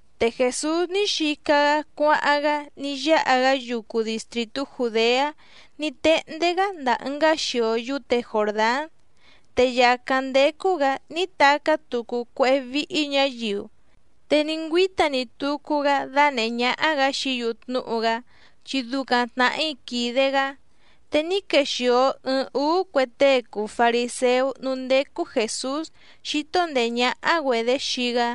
Te Jèsús ní xica‑gá cuáháⁿ‑gá ní yáha‑gá yucu distrìtú Jùdeá ní téhndé‑gá ndàa ɨngá xio yúte Jòrdán. Te yàcáⁿ ndécú‑gǎ ní tacá tucu cuéhé víhí ñǎyiu, te ní ngüíta‑ni tucu‑gá dánèhé ñáhá‑gǎ xií‑yu tnúhu‑gá chi ducaⁿ tnàhí quìde‑gá. Te ní quèxio ɨɨⁿ úú cue tée cùu fariséú núú ndécú Jèsús xíto ndèé ñáhá‑güedě xii‑gá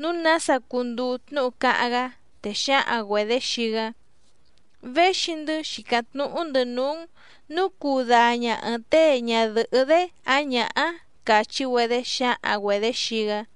nǔu nása cunduu tnúhu cáháⁿ‑gá, te xǎhaⁿ‑güedě xii‑gá: —Véxi‑ndɨ́ xìcáⁿ tnúhú‑ndɨ̌ núú‑n nǔu cuu daña ɨ̀ɨⁿ tée ñadɨ̀hɨ́‑dé ǎⁿ ñǎhá —càchí‑güedé xǎhaⁿ‑güedě xii‑gá.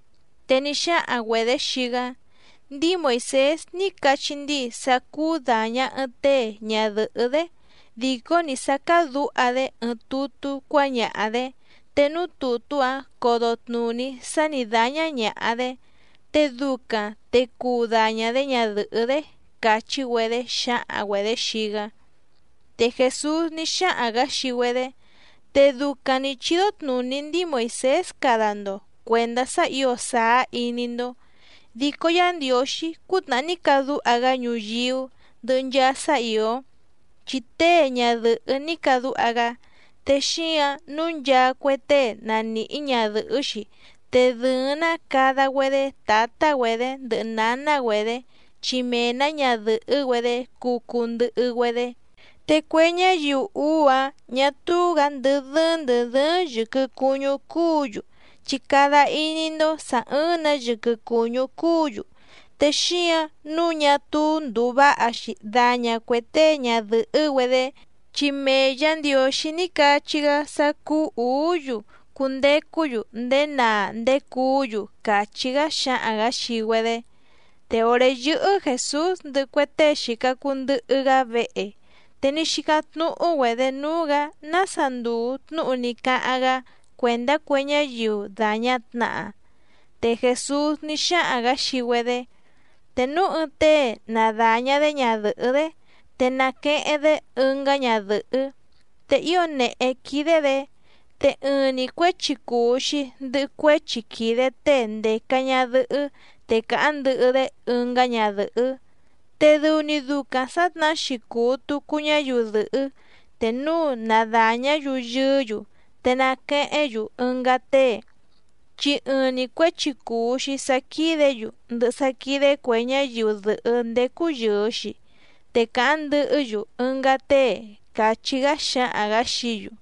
Te ní xáhaⁿ‑güedě xii‑gá: —Ndíi Moìsés ní cachí ndíi sá cúú dàña ɨɨⁿ tée ñadɨ̀hɨ́‑dé dìcó‑ni sá cádǔha‑dé ɨɨⁿ tutú cuáñaha‑dě, te núú tùtú‑áⁿ codo tnùní sá nǐ dáñá ñàha‑dé, te ducaⁿ te cuu daña‑dě ñadɨ̀hɨ́‑dé —càchí‑güedé xǎhaⁿ‑güedě xii‑gá. Te Jèsús ní xáhaⁿ‑gǎ xii‑güedé: —Te ducaⁿ nǐ chídó tnùní ndíi Moìsés cada‑ndo cuèndá sá ǐo sàá iní‑ndó. Dico Yá Ndiǒxí cútnàhá ní cadúha‑gá ñuyíú ndɨhɨ nchaa sá ìó, chi tée ñadɨ̀hɨ́ ní cadúha‑gá. Te xíǎⁿ nǔu nchaa cue tée na nìhí ñadɨ̀hɨ́‑xi, te dɨ̀ɨⁿ‑ná cada‑güedé tǎtá‑güedě ndɨhɨ nǎná‑güedě, chi mee‑nǎ ñadɨ̀hɨ́‑güedé cuu cuu ndɨhɨ‑güedé. Te cue ñáyiu úú‑áⁿ ñà túú‑gǎ ndɨ́ dɨ́ɨ́ⁿ ndɨ̀ dɨ́ɨ́ⁿ yɨ̀quɨ cuñú cúǔ‑yu, chi cada iní‑ndó sǎ ɨ́ɨ́ⁿ‑nǎ yɨquɨ cùñú cúǔ‑yu. Te xíǎⁿ nǔu ñá túú ndùu váha‑xi daña cuè tée ñadɨ̀hɨ́‑güedé, chi mee Yǎ Ndiǒxí ní cachí‑gá sá cúú ǔú‑yu cundecú‑yu ndéé naa ndéé cuú‑yu —càchí‑gá xǎhaⁿ‑gǎ xii‑güedé. Te òré yɨ́hɨ́ Jèsús ndɨhɨ cue tée xìca cuu ndɨhɨ‑gá vehe, te ní xícáⁿ tnúhú‑güedě núú‑gǎ nása ndùu tnúhu ní cáháⁿ‑gá cuèndá cue ñáyiu dàña tnaha. Te Jèsús ní xáhaⁿ‑gǎ xii‑güedé: —Te núu ɨɨⁿ tée na dàña‑dé ñadɨ̀hɨ́‑dé te naqueheⁿ‑dé ɨngá ñadɨ̀hɨ́, te ío nèhé quídé‑dě, te ɨɨⁿ‑ni cuěchi cùu‑xi ndɨhɨ cuéchi quìde tée ndèca ñadɨhɨ́ te càháⁿ ndɨhɨ‑dé ɨngá ñadɨ̀hɨ́. Te dɨu‑ni ducaⁿ sǎtnahá‑xi cùu tucu ñáyiu dɨ̀hɨ́ te núu na dàñá‑yu yɨɨ́‑yu te naquehéⁿ‑yu ɨngá tée, chi ɨɨⁿ‑ni cuěchi cùu‑xi sá quídě‑yu ndɨhɨ sá quídé cuè ñáyiu dɨ̀hɨ́ ndécú yɨ̀ɨ‑xi, te càháⁿ ndɨhɨ́‑yu ɨngá tée —càchí‑gá xǎhaⁿ‑gǎ xií‑yu.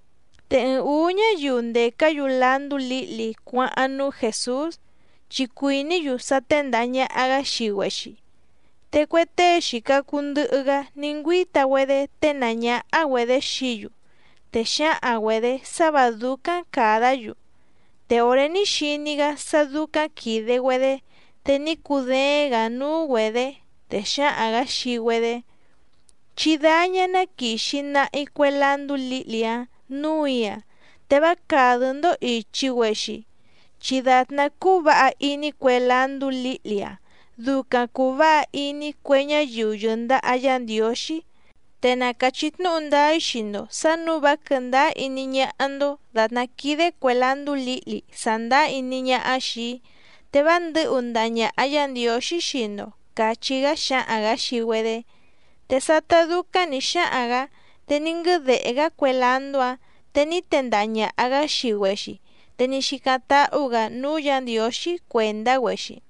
Te ɨɨⁿ ǔú ñáyiu ndècá‑yu landú lǐhli cuáháⁿ núú Jèsús, chi cuìní‑yu sá téndàha ñaha‑gá xii‑güexi. Te cue tée xìca cuu ndɨhɨ‑gá ní ngüíta‑güedé ténàá ñáhá‑güedě xií‑yu, te xǎhaⁿ‑güedě sá vǎ dúcáⁿ càdá‑yu. Te òré ní xiní‑gá sá dúcáⁿ quìde‑güedé, te ní cudééⁿ‑gǎ núú‑güedě, te xǎhaⁿ‑gǎ xii‑güedé: —Chí dáñá ná quìxi nahi cue landú lǐhli‑áⁿ nǔù‑í‑a te vá càdɨ́‑ndó ìchi‑güexi, chi dàtná cúú vǎha iní cue landú lǐhli‑áⁿ ducaⁿ cùu váha iní cue ñáyiu yɨ̀ndaha Yá Ndiǒxí. Te na càchí tnúhu ndáá‑í xii‑ndo sǎ nǔu vá quɨ̀ndáá iní ñáhá‑ndó dàtná quídé cuè landú lǐhli sàndáá iní ñáhá xìi‑í, te vá ndɨ̌hu ndaha ñàha Yá Ndiǒxí xii‑ndo —càchí‑gá xǎhaⁿ‑gǎ xii‑güedé. Te sátá dúcáⁿ nǐ xáhaⁿ‑gǎ te ní nguɨ́dèhé‑gá cue landú‑áⁿ te ní tendaha ñàha‑gá xii‑güexi, te ní xícáⁿ táhú‑gǎ núú Yǎ Ndiǒxí cuèndá‑güexi.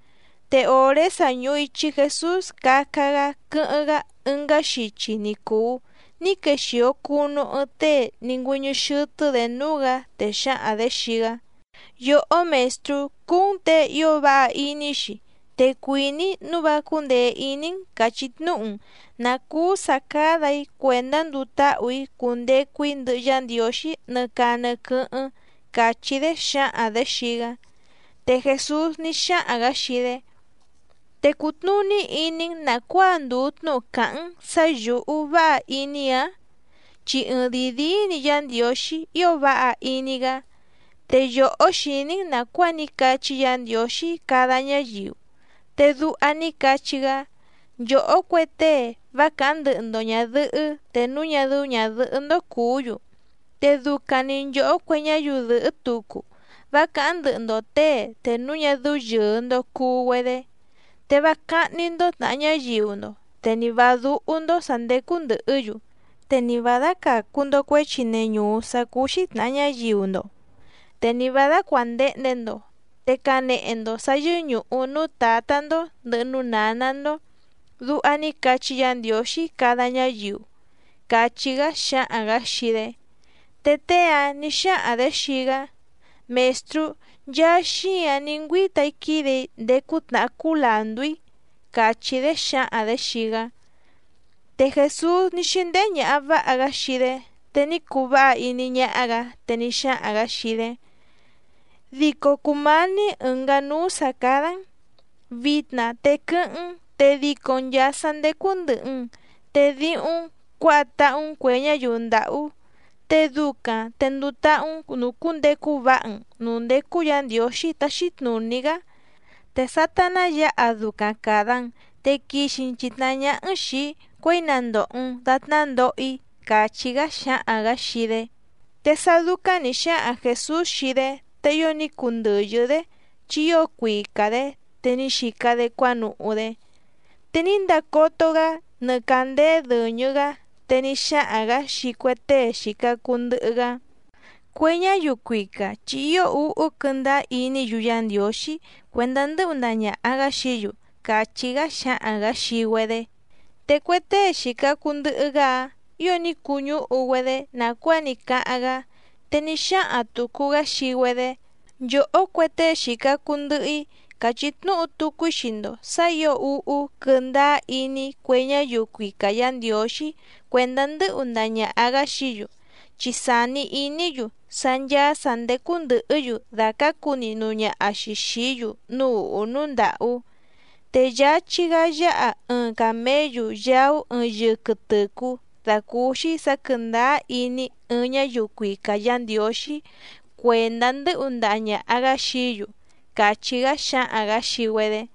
Te òré sa ñùhu ichi Jesús caca‑gá quɨ́hɨ́ⁿ‑gá ɨngá xichi ni cùu ní quexìo cunu ɨɨⁿ tée ní ngüɨ́ñɨ́ xɨ́tɨ́‑dě núú‑gǎ, te xǎhaⁿ‑dě xii‑gá: —Yòhó Mèstrú, cùu‑n tée ío váha iní‑xi, te cuìní‑í nǔu vá cúndèe iní‑n càchí tnúhu‑n nǎ cúú sǎ cádà‑í cuèndá nduu táhù‑í cundecu‑í ndɨhɨ Yá Ndiǒxí nɨ caa nɨ quɨ́hɨ́ⁿ —càchí‑dé xǎhaⁿ‑dě xii‑gá. Te Jèsús ní xáhaⁿ‑gǎ xii‑dé: —¿Te cùtnuní iní‑n nàcuáa ndùu tnúhu càháⁿ‑n sǎ yǔhú váha iní‑ǎⁿ? Chi ɨɨⁿdìi díí‑ni Yá Ndiǒxí ío váha iní‑gá. Te yòhó xìní‑n nàcuáa ní cachí Yǎ Ndiǒxí cada ñáyiu, te duha ní cachí‑gá: “Nchòhó cue tée vá càháⁿ ndɨhɨ‑ndo ñàdɨhɨ́ te núu ñá dɨ́ú ñàdɨhɨ́‑ndó cùú‑yu, te ducaⁿ‑ni nchòhó cue ñáyiu dɨ̀hɨ́ tucu vá càháⁿ ndɨhɨ‑ndo těe te núu ñá dɨ́ú yɨ̀ɨ‑ndo cuu‑güedé, te vá cáhní‑ndó tnàha ñáyiu‑ndo, te ni vǎ dúhú‑ndó sǎ ndécú ndɨ̀hɨ́‑yu, te ni vǎ dácàcu‑ndo cuéchi neñùú sá cúú‑xí tnàha ñáyiu‑ndo, te ni vǎ dácuàndehnde‑ndo, te canehe‑ndo sǎ yɨ́ñùhu núú tǎtá‑ndó ndɨ̀hɨ núú nǎná‑ndó”, duha ní cachí Yǎ Ndiǒxí cada ñáyiu —càchí‑gá xǎhaⁿ‑gǎ xii‑dé. Te tée‑áⁿ nǐ xáhaⁿ‑dě xii‑gá: —Mèstrú, nchaa xíǎⁿ ní ngüíta‑í quídè‑í ndéé cútnàhá cúú làndú‑í —càchí‑dé xǎhaⁿ‑dě xii‑gá. Te Jèsús ní xíndéhé ñàha váha‑gá xii‑dé, te ní cuu váha iní ñáhá‑gǎ, te ní xáhaⁿ‑gǎ xii‑dé: —Dico cùmání ɨ̀ngá núú sǎ cádá‑n. Vitna te quɨ́hɨ́ⁿ‑n te dico‑n nchàa sá ndécú ndɨ̀hɨ‑n, te díhúⁿ‑n cuǎha táhú‑n cuè ñáyiu ndàhú. Te ducaⁿ, te nduu táhú‑n nùcúndecu váha‑n nǔú ndécú Yǎ Ndiǒxí táxí tnùní‑gá, te sátá ná yǎha ducaⁿ càda‑n, te quixi‑n chìtnahá ñáhá‑n xìi‑í cuěi na ndòho‑n datná ndoho‑í —càchí‑gá xǎhaⁿ‑gǎ xii‑dé. Te sá dúcáⁿ nǐ xáhaⁿ Jèsús xii‑dé te ío ní cundɨ̀yɨ́‑dé chi ío cuica‑dě, te ní xica‑dé cuánuhú‑dé. Te ní ndacoto‑gá nɨ càndéé dɨ̀ñɨ‑gá, te ní xáhaⁿ‑gǎ xii cue tée xìca cuu ndɨhɨ‑gá: —Cue ñáyiu cuica chi ío úhú quɨ́ndáá iní‑yu Yá Ndiǒxí cuèndá ndɨ́hu ndaha ñàha‑gá xií‑yu —càchí‑gá xǎhaⁿ‑gǎ xii‑güedé. Te cue tée xìca cuu ndɨhɨ‑gá‑áⁿ ǐo ní cuñúhu‑güedé nàcuáa ní cáháⁿ‑gá, te ní xáhaⁿ tùcu‑gá xii‑güedé: —Nchòhó cue tée xìca cuu ndɨhɨ‑í càchí tnúhu tucu‑í xii‑ndo sǎ ǐo úhú quɨ́ndáá iní cue ñáyiu cuica Yǎ Ndiǒxí cuèndá ndɨ́hu ndaha ñàha‑gá xií‑yu, chi sàni iní‑yu sá ncháá sǎ ndécú ndɨ̀hɨ́‑yu dàcácu nihnu ñaha‑xi xìí‑yu núú ùhú núú ndàhú. Te yáchí‑gá yáha ɨɨⁿ càméyu yaú ɨɨⁿ yɨquɨ tɨ̀cú dàcúúxí sǎ quɨ̀ndáá iní ɨɨⁿ ñáyiu cuica Yǎ Ndiǒxí cuèndá ndɨ́hu ndaha ñàha‑gá xií‑yu —càchí‑gá xǎhaⁿ‑gǎ xii‑güedé.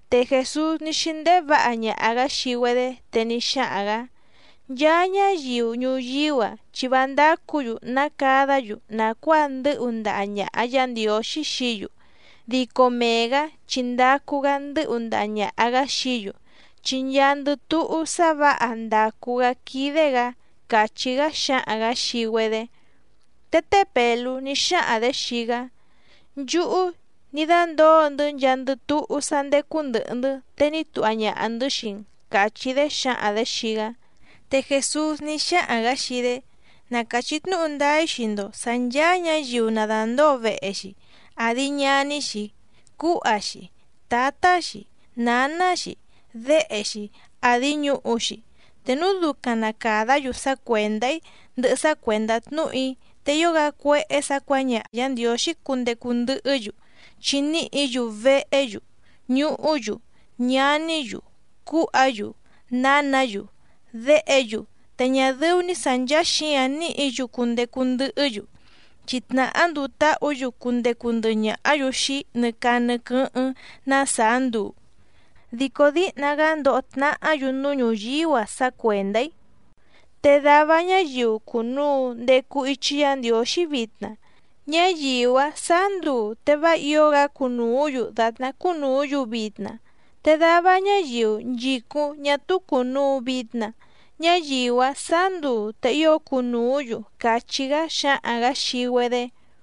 Te Jèsús ní xíndéhé vǎha ñaha‑gǎ xii‑güedé, te ní xáhaⁿ‑gǎ: —Nchaa ñáyiu ñuyíú‑a chi vá ndácǔ‑yu ná cadá‑yu nàcuáa ndɨ́hu ndaha ñàha Yá Ndiǒxí xií‑yu, dico mee‑gǎ chi ndacu‑gá ndɨ́hu ndaha ñàha‑gá xií‑yu, chi nchaandɨ túhú sá vǎha ndàcu‑gá quídé‑gǎ —càchí‑gá xǎhaⁿ‑gǎ xii‑güedé. Te té Pèlú ní xáhaⁿ‑dě xii‑gá: —Nchúhú ní dándǒo‑ndɨ́ nchaandɨ túhú sá ndécú ndɨ̀hɨ‑ndɨ́ te ní tuha ñaha‑ndɨ̌ xii‑n —càchí‑dé xǎhaⁿ‑dě xii‑gá. Te Jèsús ní xáhaⁿ‑gǎ xii‑dé: —Na càchí tnúhu ndáá‑í xii‑ndo sǎ ncháá ñǎyiu na dàndóo vehe‑xi, àdi ñaní‑xi, cúha‑xi, tǎtá‑xi, nǎná‑xi, déhe‑xi, àdi ñuhu‑xi, te núu ducaⁿ na càdá‑yu sá cuèndá‑í ndɨhɨ sá cuèndá tnúhu‑í, te ío‑gá cuéhé sǎ cuǎñaha Yǎ Ndiǒxí cundecu ndɨhɨ́‑yu, chi níhǐ‑yu vehé‑yu, ñuhú‑yu, ñaní‑yu, cúha‑yu, nǎnǎ‑yu, déhe‑yu, te ñá dɨ́ú‑ní sǎ nchàa xíǎⁿ níhǐ‑yu cundecu ndɨhɨ́‑yu, chi tnàhá nduu táhǔ‑yu cundecu ndɨhɨ ñàhá‑yu xii‑í nɨ caa nɨ quɨ́hɨ́ⁿ ná sàá nduu. Dico díhna‑gá ndoho tnahá‑yu núú ñuyíú‑a sá cuèndá‑í. Te dava ñáyiu cùnuu ndecu ichi Yá Ndiǒxí vitna, ñáyiu‑áⁿ sǎá nduu te vá ǐo‑gá cunùú‑yu dàtná cúnùú‑yu vitna, te dava ñáyiu nchìcúⁿ ñá túú cùnuu vitna ñáyiu‑áⁿ sǎá nduu te ío cunùú‑yu —càchí‑gá xǎhaⁿ‑gǎ xii‑güedé.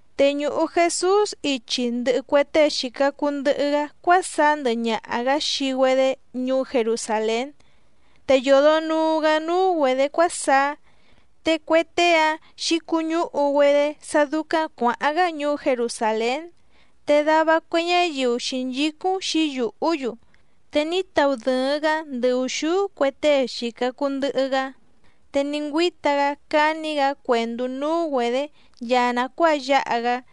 Te ñùhu Jesús ichi ndɨhɨ cue tée xìca cuu ndɨhɨ‑gá cuásaá ndɨhɨ ñaha‑gǎ xii‑güedé ñuú Jerusàlén, te yòdo nuu‑gá núú‑güedě cuásaá. Te cue tée‑áⁿ xǐcuñúhu‑güedé sá dúcáⁿ cuǎháⁿ‑gá ñuú Jerusàlén, te dava cue ñáyiu xǐnchícúⁿ xǐyùhú‑yu. Te ní taudɨ̀ɨⁿ‑gá ndɨ ùxúú cue tée xìca cuu ndɨhɨ‑gá, te ní ngüíta‑gá cání‑gǎ cuèndú núú‑güedě nchaa nàcuáa yáha‑gá.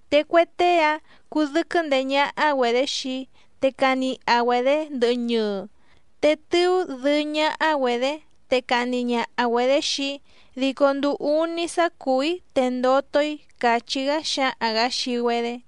Te cue tée‑áⁿ cudɨ́quɨ́ ndeé ñáhá‑güedě xii‑í, te caniha‑güedě ndɨhɨ ñɨɨ, te tɨú dɨɨ́ ñáhá‑güedě, te cahni ñaha‑güedě xii‑í dico nduu úní sá cùú‑í te ndoto‑í —càchí‑gá xǎhaⁿ‑gǎ xii‑güedé.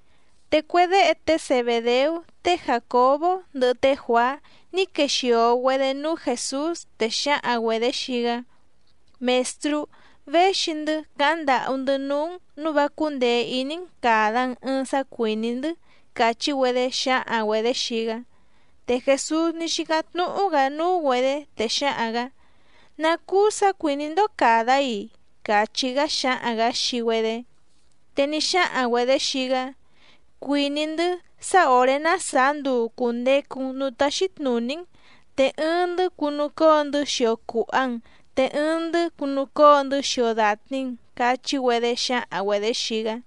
Te cue déhe té Zebèdeú té Jàcobó ndɨhɨ té Juàá ní quexìo‑güedé núú Jèsús, te xǎhaⁿ‑güedě xii‑gá: —Mèstrú, véxi‑ndɨ́ càháⁿ ndàhú‑ndɨ́ núú‑n nǔu vá cúndèe iní‑n càda‑n ɨɨⁿ sá cuìní‑ndɨ́ —càchí‑güedé xǎhaⁿ‑güedě xii‑gá. Te Jèsús ní xícáⁿ tnúhú‑gǎ núú‑güedě, te xǎhaⁿ‑gǎ: —¿Ná cúú sǎ cuìní‑ndó càda‑í‑i? —càchí‑gá xǎhaⁿ‑gǎ xii‑güedé. Te ní xáhaⁿ‑güedě xii‑gá: —Cuìní‑ndɨ́ sá òré ná sàá nduu cùndecu‑n núú táxí tnùní‑n, te ɨɨⁿ‑ndɨ́ cunucóo‑ndɨ́ xio cùha‑n te ɨɨⁿ‑ndɨ́ cunucóo‑ndɨ́ xio dàtni‑n —cachí‑güedé xǎhaⁿ‑güedě xii‑gá.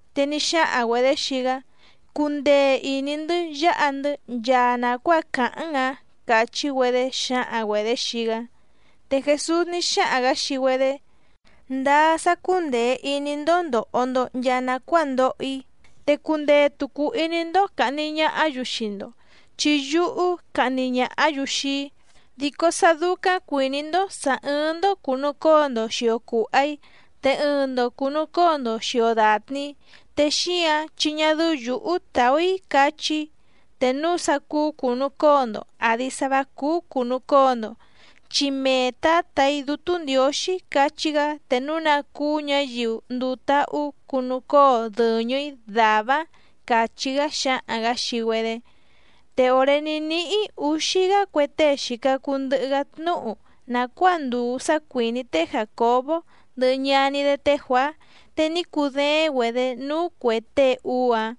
Te ní xáhaⁿ‑güedě xii‑gá: —Cundee ìní‑ndɨ́ yáha‑ndɨ́ nchaa nàcuáa càháⁿ‑n‑ǎⁿ —càchí‑güedé xǎhaⁿ‑güedě xii‑gá. Te Jèsús ní xáhaⁿ‑gǎ xii‑güedé: —Ndáá sá cúndèe iní‑ndó ndòho‑ndo nchaa nacuáa ndoho‑í, te cundee tùcu iní‑ndó càhni ñahá‑yu xii‑ndo, chi yúhú cahni ñàhá‑yu xii‑í. Dico sá dúcáⁿ cuìní‑ndó sǎ ɨ́ɨ́ⁿ‑ndó cùnucóo‑ndo xìo cuha‑í te ɨɨⁿ‑ndo cùnucóo‑ndo xìo datni‑í, te xíǎⁿ chi ñá dɨ́ú yǔhú tàú‑í cachí‑í te núu sá cúú cùnucóo‑ndo àdi sá vǎ cúú cùnucóo‑ndo, chi mee Tǎtà‑í Dútú Ndiǒxí cachí‑gá te núu ná cúú ñǎyiu nduu táhú cunucóo dɨ̀ñɨ‑í dàvá‑áⁿ —càchí‑gá xǎhaⁿ‑gǎ xii‑güedé. Te òré ní níhí ǔxí‑gá cue tée xìca cuu ndɨhɨ‑gá tnúhu nàcuáa ndùu sá cuìní té Jàcobó ndɨhɨ ñaní‑dé té Juàá, te ní cudééⁿ‑güedě núú cuè tée úú‑áⁿ.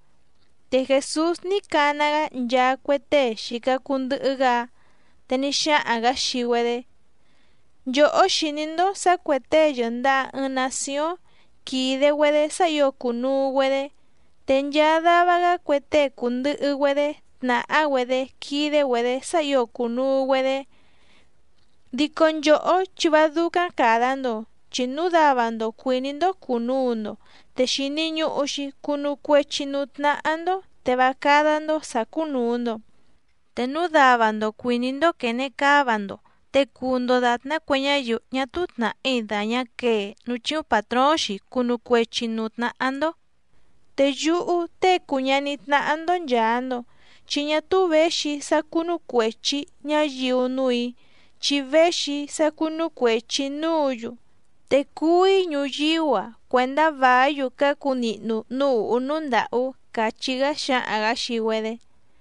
Te Jèsús ní cana‑gá nchaa cue tée xìca cuu ndɨhɨ‑gá‑áⁿ, te ní xáhaⁿ‑gǎ xii‑güedé: —Nchòhó xìní‑ndó sǎ cuè tée yɨ̀ndaha ɨɨⁿ nacióⁿ quìde‑güedé sá ǐo cùnuu‑güedé, te nchaa dava‑gá cue tée cùndɨhɨ‑güedé tnàhá‑güedé quídé‑güedě sá ǐo cùnuu‑güedé. Dico nchòhó chi vá dúcáⁿ càda‑ndo. Chi núu dava‑ndo cuìní‑ndó cùnuu‑ndo te xìni ñuhu‑xi cunu cuechi núú tnáhá‑ndó te vá cádá‑ndó sǎ cúnùu‑ndo. Te núu dava‑ndo cuìní‑ndó quène cáva‑ndo, te cuu‑ndo dàtná cue ñáyiu ñá túú tnàhí dàñá quee núú chíúⁿ pàtróóⁿ‑xi cunu cuechi nǔú tnáhá‑ndó. Te yúhú Tée cùu ñaní tnáhá‑ndó nchàa‑ndo, chi ñá túú věxi‑í sá cúnú cuèchi ñáyiu núù‑í, chi véxi‑í sá cúnú cuèchi‑í núǔ‑yu. Te cuú‑í ñuyíú‑a cuèndá vàí‑yu cácu nihnu núú ùhú núú ndàhú —càchí‑gá xǎhaⁿ‑gǎ xii‑güedé.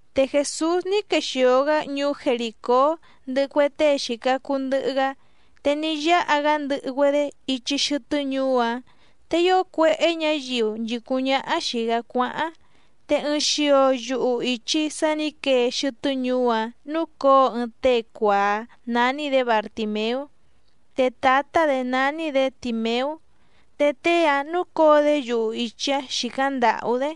Te Jèsús ní quexìo‑gá ñuú Jerìcó ndɨhɨ cue tée xìca cuu ndɨhɨ‑gá, te ní yáha‑gá ndɨhɨ‑güedé ichi xɨtɨ́ ñuú‑áⁿ, te ío cuéhé ñǎyiu nchìcúⁿ ñáhá xìi‑gá cuáháⁿ te ɨɨⁿ xio yuhu ìchi sá nǐ quee xɨtɨ́ ñuú‑áⁿ núcǒo ɨɨⁿ tée cuàá nání‑dě Bartìmeú, te tǎtá‑dě nání‑dě Tìmeú, te tée‑áⁿ núcǒo‑dé yuhu ìchi‑áⁿ xìcáⁿ ndàhú‑dé.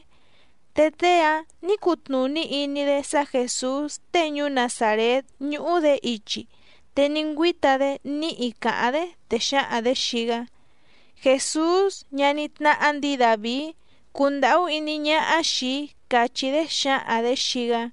Te tée‑áⁿ nǐ cutnùní iní‑dé sá Jèsús tée ñuú Nazàrét ñúhú‑dě ichi, te ní ngüíta‑dé níhi càháⁿ‑dé, te xǎhaⁿ‑dě xii‑gá: —¡Jèsús, ñaní tnáhá ndǐi Dàvií, cundàhú íní ñáhá xìi‑í! —càchí‑dé xǎhaⁿ‑dě xii‑gá.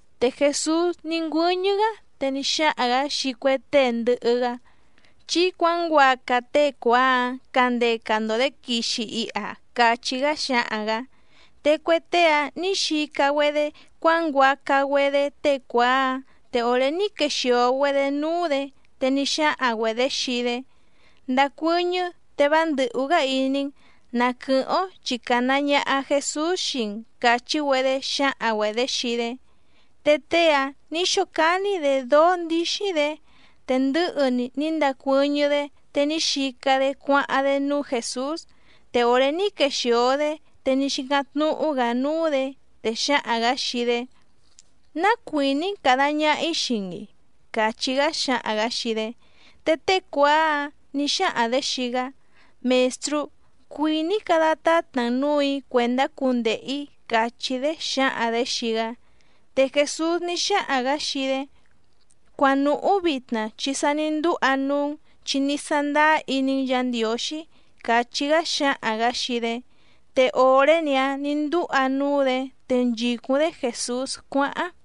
Te Jèsús ní ngüɨ́ñɨ́‑gá te ní xáhaⁿ‑gǎ xii cue tée ndɨhɨ‑gá: —Chí cuǎnguaca tée cuàá‑ǎⁿ candeca‑ndo‑dě quixi iha —càchí‑gá xǎhaⁿ‑gǎ. Te cue tée‑áⁿ nǐ xica‑güedé cuánguaca‑güedé tée cuàá‑áⁿ, te òré ní quexìo‑güedé núú‑dě te ní xáhaⁿ‑güedě xii‑dé: —Ndacuɨ́ñɨ́ te vá ndɨ̀hú‑gá iní‑n, na quɨ̀hɨ́ⁿ‑ó chi càna ñaha Jesús xii‑n —càchí‑güedé xǎhaⁿ‑güedě xii‑dé. Te tée‑áⁿ nǐ xócání‑dě dóó ndíxí‑dě, te ndɨ̌hɨ‑ni ní ndacuɨ́ñɨ́‑dé te ní xica‑dé cuáháⁿ‑dé núú Jèsús. Te òré ní quexìo‑dé te ní xícáⁿ tnúhú‑gǎ núú‑dě, te xǎhaⁿ‑gǎ xii‑dé: —¿Ná cuìní‑n càda ñaha‑í xii‑n‑i? —càchí‑gá xǎhaⁿ‑gǎ xii‑dé. Te tée cuàá‑áⁿ nǐ xáhaⁿ‑dě xii‑gá: —Mèstrú, cuìní‑í cada tátna‑n nǔù‑í cuèndá cundehe‑ǐ —càchí‑dé xǎhaⁿ‑dě xii‑gá. Te Jèsús ní xáhaⁿ‑gǎ xii‑dé: —Cuanùhú vitna, chi sa ní ndúha núú‑n chi ní sándáá iní‑n Yǎ Ndiǒxí —càchí‑gá xǎhaⁿ‑gǎ xii‑dé. Te òré‑ni‑áⁿ nǐ ndúha núú‑dě te nchìcúⁿ‑dé Jèsús cuáháⁿ.